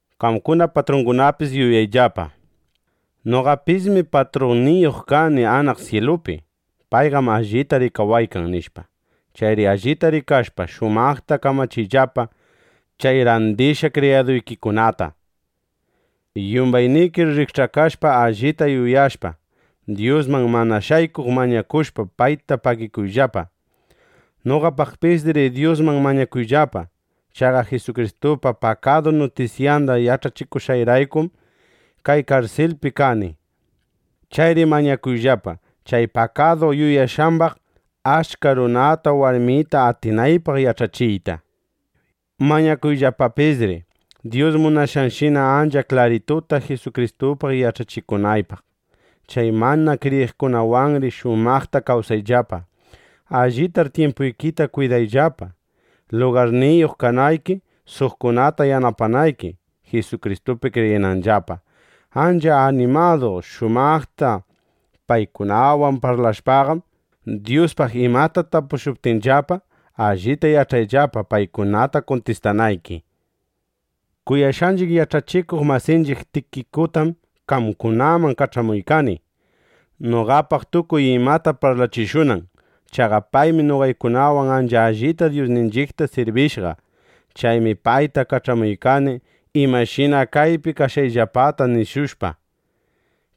Qamkuna, patrungunapis yuyayllapa: Noqapismi patrunniyuq kani anaq syilupi. Payqam allita rikawaykan, nishpa. Chayri allita rikashpa, shumaqta kamachiyllapa chay randishqa kriyaduykikunata. Yumbaynikir rikch'akashpa, allita yuyashpa, Dyusman mana shaykuq mañakushpa, payta pagikuyllapa. Noqapaqpisri Dyusman mañakuyllapa. Chaqa Jisukristupa pakadu nutisyanda yach'achikushqayraykum kay karsilpiqa kani. Chayri mañakuyllapa, chay pakadu yuyashqambaq achka runata warmita atinaypaq yach'achiyta. Mañakuyllapapisri Dyus munashqanshina ancha klarituta Jisukristupaq yach'achikunaypaq. Chay mana kriyiqkunawanri shumaqta kawsayllapa. Allitar tyimpuykita kwidayllapa, lugarniyuq kanayki, suqkunata yanapanayki, Jisukristupi kriyinanllapa. Ancha animadu shumaqta paykunawan parlashpaqam, Dyuspaq imata tapushuptinllapa, allita yach'ayllapa, paykunata kuntistanayki. Kuyashqanchiq yach'achikuq masinchiq Tikikutam qamkunaman kach'amuykani, noqapaq tukuy imata parlachishunan. Chaqa paymi noqaykunawan ancha allita Dyusninchiqta sirbishqa. Chaymi payta kach'amuykani, imashina kaypi kashqayllapata nishushpa,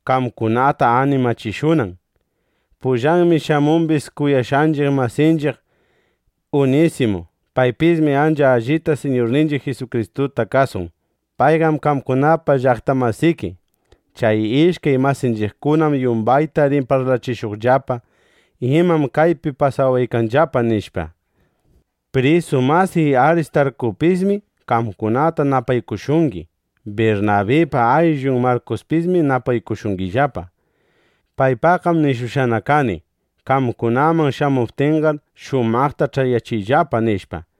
qamkunata animachishunan. Pullanmi shamumbis kuyashqanchiq masanchiq Unisimu. Paypismi ancha allita Siñurninchiq Jisukristuta kasun. Payqam qamkunapa llaqta masiki. Chay ishkay masanchiqkunam yumbayta rin parlachishuqllapa, imam kaypi pasawaykanllapa, nishpa. Prisu masiy Aristarkupismi qamkunata napaykushungi. Birnabipa ayllun Markuspismi napaykushungillapa. Paypaqqam nishushqana kani: Qamkunaman shamuptinqar, shumaqta ch'ayachiyllapa, nishpa.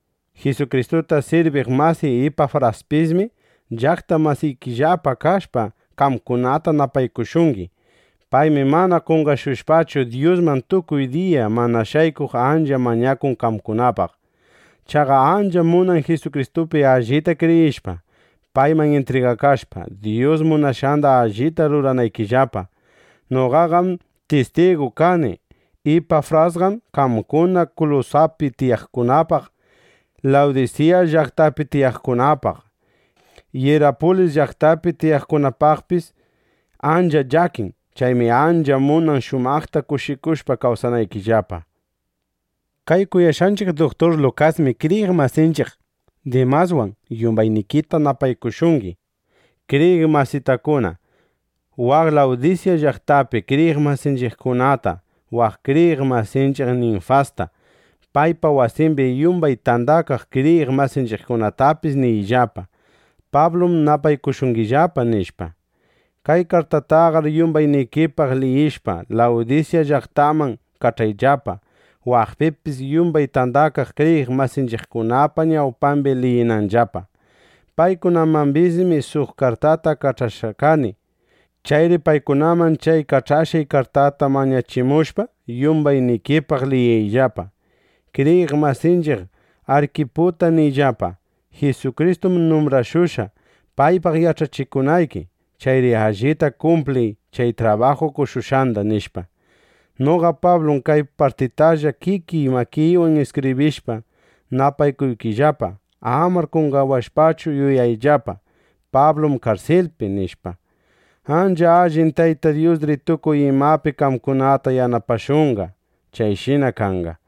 Jisukristuta sirbiq masiy Ipafraspismi, llaqta masikillapa kashpa, qamkunata napaykushungi. Paymi mana qonqashushpachu, Dyusman tukuy diya mana shaykuq ancha mañakun qamkunapaq. Chaqa ancham munan Jisukristupi allita kriyishpa, payman intrigakashpa, Dyus munashqanda allita ruranaykillapa. Noqaqam tistigu kani; Ipafrasqam qamkuna Kulusaspi tiyaqkunapaq, Lawdisya llaqtapi tiyaqkunapaq, Yirapulis llaqtapi tiyaqkunapaqpis ancha llakin. Chaymi ancha munan, shumaqta kushikushpa kawsanaykillapa. Kay kuyashqanchiq duktur Lukasmi kriyiq masinchiq Dimaswan yumbaynikita napaykushungi. Kriyiq masitakuna, waq Lawdisya llaqtapi kriyiq masinchiqkunata, waq kriyiq masinchiq Ninfasta, paypa wasimbi yumbay tandakaq kriyiq masinchiqkunatapis niyllapa: “Pablum napaykushungillapa”, nishpa. Kay kartaytaqar yumbaynikipaq liyishpa, Lawdisya llaqtaman kach'ayllapa, waqpipis yumbay tandakaq kriyiq masinchiqkunapa ñawpambi liyinanllapa. Paykunamambismi suq kartata kach'ashqana kani. Chayri paykunaman chay kach'ashqay kartata mañachimushpa, yumbaynikipaq liyiyllapa. Kriyiq masinchiq Arkiputa niyllapa: “Jisukristum numbrashushqa, paypaq yach'achikunayki. Chayri allita kumpliy chay trabaju qoshushqanda”, nishpa. Noqa Pablum kay partitalla kikiy makiywan iskibrishpa, napaykuykillapa. Amar qonqawashpachu yuyayllapa: Pablum karsilpi, nishpa. ¡Ancha allin Tayta Dyusri tukuy imapi qamkunata yanapashunqa! ¡Chayshina kanqa!